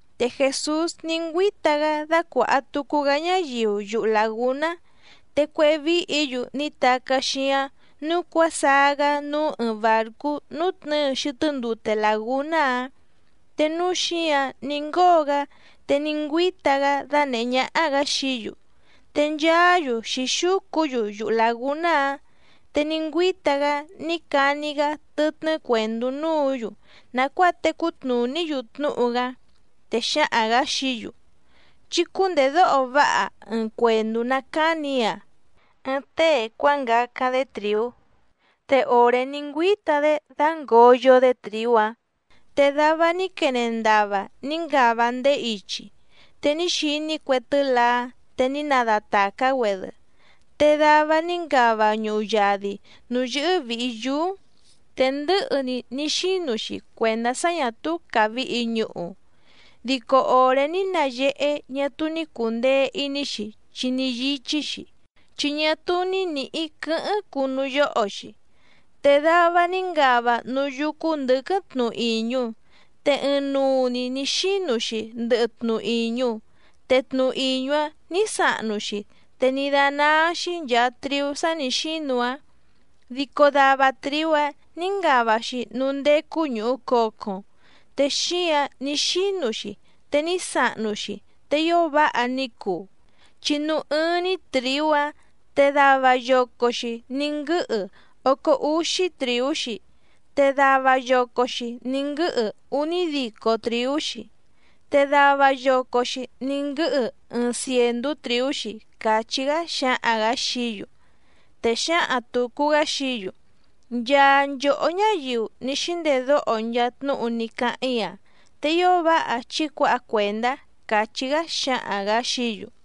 Te Jèsús ní ngüíta‑gá dácuàha tucu‑gá ñáyiu yuhu làgúná. Te cuéhé víhǐ‑yu ní tacá xíáⁿ nǔu cuásaá‑gá núú ɨɨⁿ bàrcú nútnɨ̌ɨ xɨtɨ́ ndute làgúná‑áⁿ, te núú xǐǎⁿ ní ngóo‑gá te ní ngüíta‑gá dánèhé ñáhá‑gǎ xií‑yu, te nchaá‑yu xǐxúcu‑yu yuhu làgúná‑áⁿ. Te ní ngüíta‑gá ní cani‑gá tɨtnɨ́ cuèndú núǔ‑yu nàcuáa tecú tnùní‑yu tnúhu‑gá, te xǎhaⁿ‑gǎ xií‑yu: —Chí cúndèdóho váha ɨɨⁿ cuèndú ná càni‑í‑a. Ɨɨⁿ tée cuángacáⁿ‑dé trìú. Te òré ní ngüíta‑dé dǎngoyo‑dé trìú‑áⁿ, te dava ní quene ndava ní ngava ndéé ichi, te ní xiní cue tɨ́laá te ní nadatàcá‑güedɨ. Te dava ní ngava ñuhu yadi nǔú yɨ́hɨ́ vìhi yúú, te ndɨ̌hɨ‑ni ní xínu‑xi cuèndá sá ñà túú càvihi ñuhu. Dico òré ní nayehé ñá túú ní cùndee iní‑xi chi ní yíchí‑xi, chi ñá túú ní nǐhí quɨ̌hɨ́ⁿ cùnú yóho‑xi. Te dava ní ngava núú yúcú ndɨ̌quɨ́ⁿ tnu ìñu, te ɨɨⁿnuu‑ni nǐ xínu‑xi ndɨhɨ tnu ìñu, te tnu ìñu‑áⁿ nǐ sahnu‑xi te ní dánáá‑xí nchàa triú sá nǐ xínu‑áⁿ. Dico dava trìú‑áⁿ nǐ ngava‑xi núú ndécú ñùhu cocoⁿ, te xíǎⁿ ní xínu‑xi te ní sahnu‑xi te ío váha ní cuu, chi núú ɨ́ɨ́ⁿ‑ní trìú‑áⁿ te dava yoco‑xi ní nguɨ́hɨ ócó úxí trìú‑xi, te dava yoco‑xi ní nguɨ́hɨ únídico trìú‑xi, te dava yoco‑xi ní nguɨ́hɨ ɨɨⁿ cièndú trìú‑xi —càchí‑gá xǎhaⁿ‑gǎ xií‑yu. Te xǎhaⁿ tùcu‑gá xií‑yu: —Nchaa nchòhó ñáyiu ní xíndedóho nchaa tnúhu ní cáháⁿ‑í‑a, te ío váha chí cuǎha cuèndá —càchí‑gá xǎhaⁿ‑gǎ xií‑yu.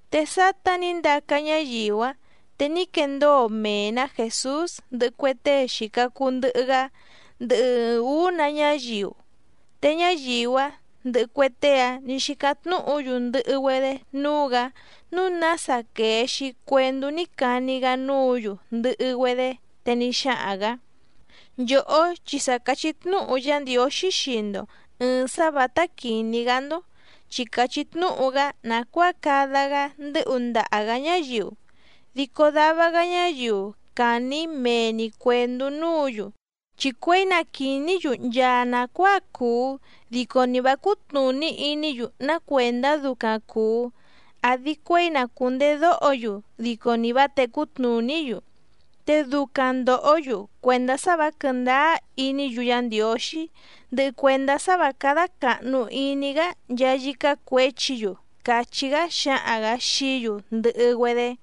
Te sátá nǐ ndaca ñáyiu‑áⁿ te ní quendóo mee‑nǎ Jèsús ndɨhɨ cue tée xìca cuu ndɨhɨ‑gá, ndɨhɨ ɨɨⁿ ǔú‑nǎ ñáyiu. Te ñáyiu‑áⁿ ndɨhɨ cue tée‑áⁿ nǐ xícáⁿ tnúhǔ‑yu ndɨhɨ‑güedé núú‑gǎ, núu nása quèe‑xi cuendú ní cani‑gá núǔ‑yu ndɨhɨ‑güedé. Te ní xáhaⁿ‑gǎ: —Nchòhó chi sa càchí tnúhu Yá Ndiǒxí xii‑ndo ɨ̀ɨⁿ sá vǎtá quìní‑gá‑ndó, chi càchí tnúhu‑gá nàcuáa cada‑gá ndɨ́hu ndaha‑gǎ ñáyiu, dico dava‑gá ñáyiu càni‑í mee‑ni cuèndú núǔ‑yu. Chi cuěi na quìní‑yu nchaa nàcuáa cuu dico ni vǎ cútnùní iní‑yu ná cuèndá ducaⁿ cùu, àdi cuéi na cùndedóho‑yu dico ni vǎ tècú tnùní‑yu. Te ducaⁿ ndòhó‑yu cuèndá sá vǎ quɨ̀ndáá iní‑yu Yá Ndiǒxí, ndɨhɨ cuèndá sá vǎ cádá càhnu iní‑gá nchaa yícá cuěchi‑yu —càchí‑gá xǎhaⁿ‑gǎ xií‑yu ndɨhɨ‑güedé.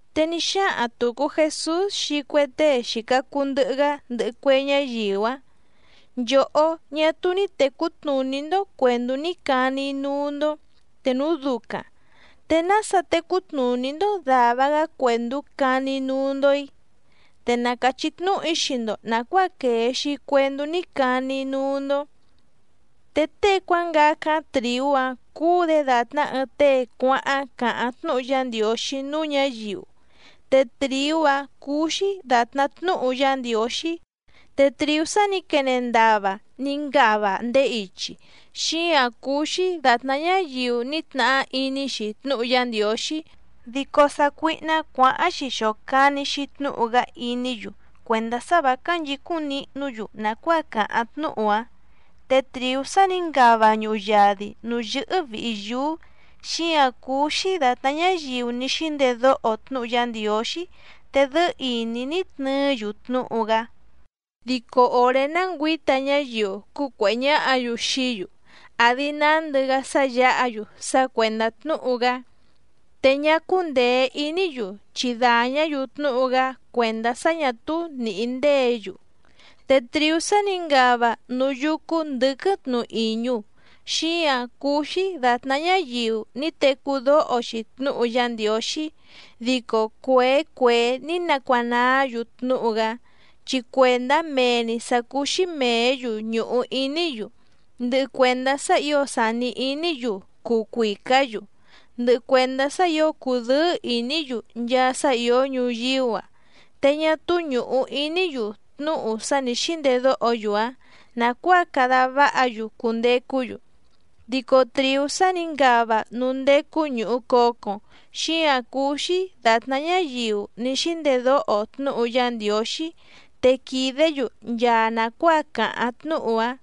Te ní xáhaⁿ tùcu Jesús xii cue tée xìca cuu ndɨhɨ‑gá, ndɨhɨ cue ñáyiu‑áⁿ: —Nchòhó, ñá túú ní tècú tnùní‑ndó cuèndú ní cani‑í núú‑ndó, te núu ducaⁿ, ¿te nása tecú tnùní‑ndó dàva‑gá cuèndú cani‑í núú‑ndó‑í? Te na càchí tnúhu‑í xii‑ndo nàcuáa quèe‑xi cuendú ní cani‑í núú‑ndó. Te tée cuángacáⁿ trìú‑áⁿ cúú‑dě dàtná ɨɨⁿ tée cuáháⁿ càháⁿ tnúhu Yá Ndiǒxí núú ñǎyiu. Te trìú‑áⁿ cúú‑xí dàtná tnúhu Yá Ndiǒxí, te trìú sá nǐ quene ndava ní ngava ndéé ichi, xíǎⁿ cúú‑xí dàtná ñáyiu ní tnahá iní‑xi tnúhu Yá Ndiǒxí, dico sácuíhná cuǎháⁿ‑xi xòcani‑xi tnúhu‑gá iní‑yu cuèndá sá vǎ cánchǐcúⁿ nihnú‑yu nàcuáa càháⁿ tnúhu‑áⁿ. Te trìú sá nǐ ngava ñuhu yadi nǔú yɨ́hɨ́ vìhi yúú, xíǎⁿ cúú‑xí dàtná ñáyiu ní xíndedóho tnúhu Yá Ndiǒxí te dɨ́ɨ́ ìní ní tnɨɨ́‑yu tnúhu‑gá. Dico òré ná ngüǐta ñáyiu cúcuèhé ñáhǎ‑yu xií‑yu àdi nándɨ‑gá sá yǎha‑yu sá cuèndá tnúhu‑gá, te ñá cúndèe iní‑yu chi dàñá‑yu tnúhu‑gá cuèndá sá ñà túú nìhí ndéě‑yu. Te trìú sá nǐ ngava núú yúcú ndɨ̌quɨ́ⁿ tnu ìñu xíǎⁿ cúú‑xí dàtná ñáyiu ní tecú dóho‑xi tnúhu Yá Ndiǒxí, dico cuèé cuèé ní nacuanaá‑yu tnúhu‑gá, chi cuèndá mee‑ni sǎ cúú‑xí mèé‑yu ñùhu iní‑yu, ndɨhɨ cuèndá sá ǐo sàni iní‑yu cuu cuìcá‑yu, ndɨhɨ cuèndá sá ǐo cùdɨ́ɨ́ ìní‑yu nchaa sá ìó ñuyíú‑a, te ñá túú ñùhu iní‑yu tnúhu sá nǐ xíndedóho‑yu‑áⁿ nàcuáa cada váha‑yu cundecú‑yu. Dico trìú sá nǐ ngava núú ndécú ñùhu cocoⁿ, xíǎⁿ cúú‑xí dàtná ñáyiu ní xíndedóho tnúhu Yá Ndiǒxí te quìdé‑yu nchaa nàcuáa càháⁿ tnúhu‑áⁿ.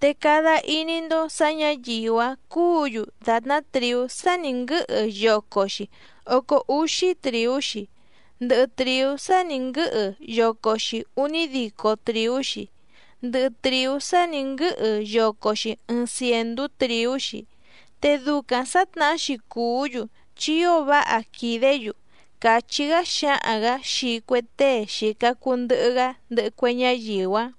Te cada iní‑ndó sǎ ñǎyiu‑áⁿ cúǔ‑yu dàtná trìú sá nǐ nguɨ́hɨ yoco‑xi ócó úxí trìú‑xi, ndɨhɨ trìú sá nǐ nguɨ́hɨ yoco‑xi únídico trìú‑xi, ndɨhɨ trìú sá nǐ nguɨ́hɨ yoco‑xi ɨɨⁿ cièndú trìú‑xi. Te ducaⁿ sǎtnahá‑xi cùú‑yu chi ío váha quìdé‑yu —càchí‑gá xǎhaⁿ‑gǎ xii cue tée xìca cuu ndɨhɨ‑gá ndɨhɨ cue ñáyiu‑áⁿ.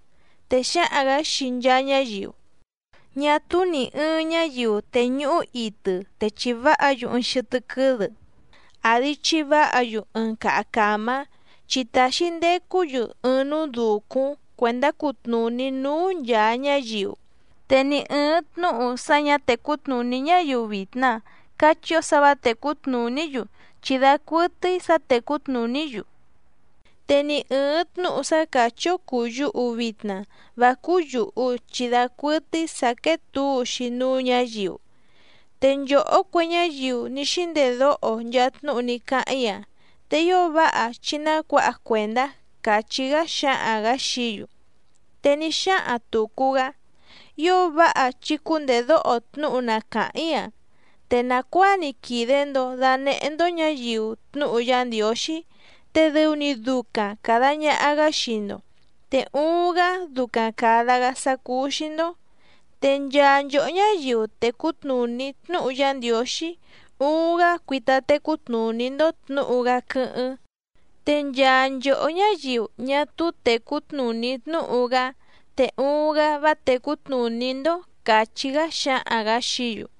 Te xǎhaⁿ‑gǎ xii nchaa ñáyiu: —Ñá túú nì ɨɨⁿ ñáyiu tèñuhú itɨ te chiváha‑yu ɨɨⁿ xɨtɨ́ quɨ́dɨ, àdi chiváha‑yu ɨɨⁿ caha càmá, chi tàxi ndecú‑yu ɨɨⁿ núú dùcúⁿ cuèndá cutnùní núú nchàa ñáyiu. Te ni ɨ̀ɨⁿ tnúhu sá ñǎ tècú tnùní ñáyiu vitna cachí‑ó sǎ vǎ tècú tnùní‑yu chi dacuɨtɨ́í sǎ tècú tnùní‑yu, te ni ɨ̀ɨⁿ tnúhu sá càchí‑ó cùu yuhu vitna vá cúú yùhu chi dacuɨtɨ́í sǎ quéé tǔu‑xi núú ñǎyiu. Te nchòhó cue ñáyiu ní xíndedóho nchaa tnúhu ní cáháⁿ‑í‑a, te ío váha chí ná cuǎha cuèndá —càchí‑gá xǎhaⁿ‑gǎ xií‑yu. Te ní xáhaⁿ tùcu‑gá: —Ío váha chí cúndèdóho tnúhu na càháⁿ‑í‑a. Te nàcuáa‑ni quìde‑ndo danehé‑ndó ñǎyiu tnúhu Yá Ndiǒxí, te dɨu‑ni ducaⁿ càda ñaha‑gá xii‑ndo, te uuⁿ‑gá ducaⁿ càda‑gá sá cúú‑xí‑ndó. Te nchaa nchòhó ñáyiu tècú tnùní tnúhu Yá Ndiǒxí, uuⁿ‑gá cuita tecú tnùní‑ndó tnǔhu‑gá quɨ́hɨ́ⁿ. Te nchaa nchòhó ñáyiu ñá túú tècú tnùní tnúhu‑gá, te uuⁿ‑gá vá tècú tnùní‑ndó —càchí‑gá xǎhaⁿ‑gǎ xií‑yu.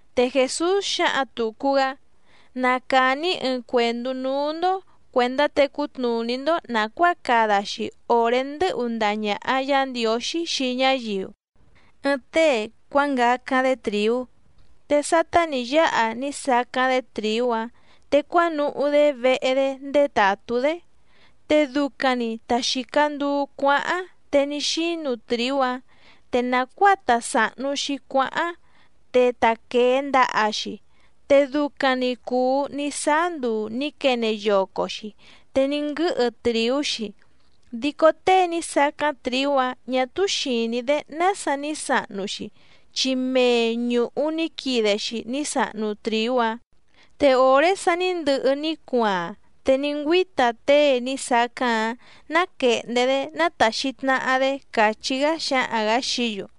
Te Jèsús xǎhaⁿ tùcu‑gá: —Na càni‑í ɨɨⁿ cuèndú núú‑ndó cuèndá tecú tnùní‑ndó nàcuáa cada‑xi òré ndɨ́hu ndaha ñàha Yá Ndiǒxí xii ñáyiu. Ɨɨⁿ tée cuángacáⁿ‑dé trìú. Te sátá nǐ yáha ní sacáⁿ‑dé trìú‑áⁿ, te cuánuhú‑dé vehe‑dé ndétàtú‑dé. Te ducaⁿ‑ni ta xìca nduu cuáháⁿ te ní xínu trìú‑áⁿ, te nàcuáa ta sàhnu‑xi cuáháⁿ te ta quèe ndaha‑xi, te ducaⁿ‑ni cùu ní sáá nduu nǐ quene yoco‑xi te ní nguɨ́hɨ trìú‑xi, dico tée ní sacáⁿ trìú‑áⁿ ñà túú xìní‑dé nása ní sahnu‑xi, chi mee ñùhu ní quide‑xi ní sahnu trìú‑áⁿ. Te òré sa ní ndɨhɨ ní cuaaⁿ te ní ngüíta tée ní sacáⁿ‑áⁿ náquèhndé‑dé nátàxi tnaha‑dé —càchí‑gá xǎhaⁿ‑gǎ xií‑yu.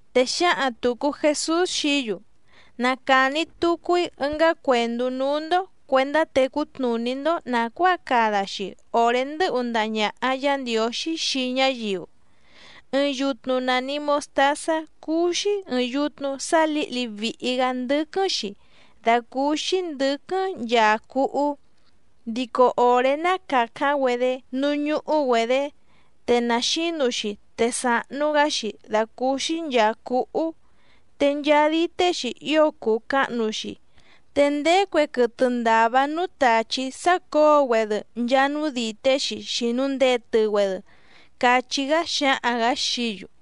Te xǎhaⁿ tùcu Jesús xií‑yu: —Na càni tucu‑í ɨngá cuèndú núú‑ndó cuèndá tecú tnùní‑ndó nàcuáa cada‑xi òré ndɨ́hu ndaha ñàha Yá Ndiǒxí xii ñáyiu. Ɨɨⁿ yutnu nàni mostázá cúú‑xí ɨ̀ɨⁿ yutnu sá lǐhli vìhi‑gá ndɨ́quɨ́ⁿ‑xi dàcúúxí ndɨ̌quɨ́ⁿ nchaa cúhú, dico òré ná càcáⁿ‑güedé núú ñúhú‑güedě, te na xǐnu‑xi te sàhnu‑gá‑xi dàcúúxí nchàa cúhú, te nchaa dité‑xi ío cùu cahnu‑xi, te ndéé cue quɨtɨ ndàva núú tàchí sácǒo‑güedɨ nchaa núú dìté‑xi xìnu ndetɨ‑güedɨ —cachí‑gá xǎhaⁿ‑gǎ xií‑yu.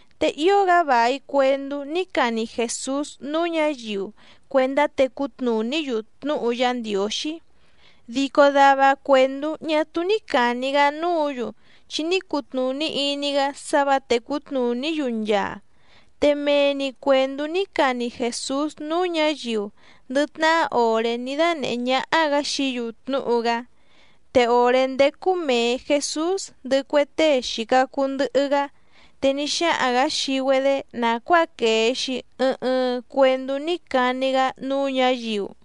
Te ío‑gá vài cuendú ní cani Jèsús núú ñǎyiu cuèndá tecú tnùní‑yu tnúhu Yá Ndiǒxí, dico dava cuèndú ñá túú ní càni‑gá núǔ‑yu, chi ní cutnùní iní‑gá sá vǎ tècú tnùní‑yu nchaa. Te mee‑ni cuèndú ní cani Jèsús núú ñǎyiu ndɨ tnahá òré ní dánèhé ñáhá‑gǎ xií‑yu tnúhu‑gá. Te òré ndécú mèe Jesús ndɨhɨ cue tée xìca cuu ndɨhɨ‑gá, te ní xáhaⁿ‑gǎ xii‑güedé nàcuáa quèe‑xi ɨɨⁿ ɨɨⁿ cuendú ní cani‑gá núú ñǎyiu.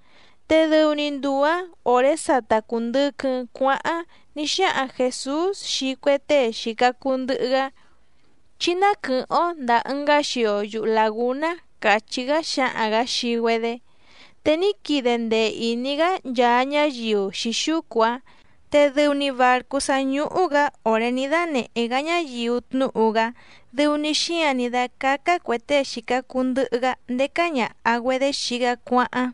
Te dɨu‑ni nduu‑ǎⁿ òré sa ta cùndɨquɨⁿ cuáháⁿ ní xáhaⁿ Jèsús xii cue tée xìca cuu ndɨhɨ‑gá: —Chí ná quɨ̀hɨ́ⁿ‑ó ndàa ɨngá xio yuhu làgúná —càchí‑gá xǎhaⁿ‑gǎ xii‑güedé. Te ní quide ndee ìní‑gá nchaa ñáyiu xǐxúcu‑áⁿ, te dɨu‑ni bàrcú sá ñúhú‑gǎ òré ní dánèhé‑gá ñáyiu tnúhu‑gá dɨu‑ni xíǎⁿ ní dácácá cuè tée xìca cuu ndɨhɨ‑gá ndécá ñàha‑güedé xii‑gá cuáháⁿ,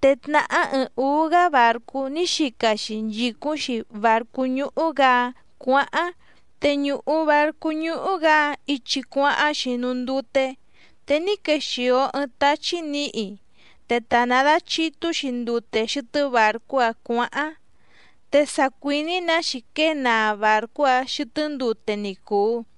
te tnàhá ɨɨⁿ ǔú‑gá bàrcú ní xica‑xi nchìcúⁿ‑xi bàrcú ñúhú‑gǎ‑áⁿ cuǎháⁿ. Te ñùhu barcú ñúhú‑gǎ‑áⁿ ichi cuáháⁿ‑xi núú ndute, te ní quexìo ɨɨⁿ táchí nǐhi, te ta nàdachitú‑xi ndute xɨtɨ́ bàrcú‑áⁿ cuǎháⁿ, te sa cuìní‑nǎ‑xi quée naa bàrcú‑áⁿ xɨtɨ́ ndute ni cùu.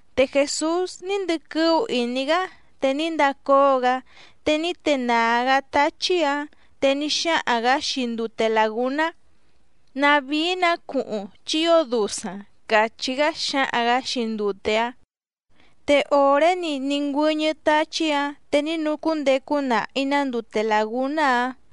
Te Jèsús ní ndɨquɨ́ú ìní‑gá te ní ndacóo‑gá, te ní tenàá‑gá táchí‑ǎⁿ, te ní xáhaⁿ‑gǎ xii ndute làgúná: —¡Tnavíí‑nǎ cuhuⁿ, chi ío dusaⁿ! —càchí‑gá xǎhaⁿ‑gǎ xii ndute‑áⁿ. Te òré‑ni ní ngüɨ́ñɨ́ táchí‑ǎⁿ te ní nucúndecu nahi‑nǎ ndute làgúná‑áⁿ.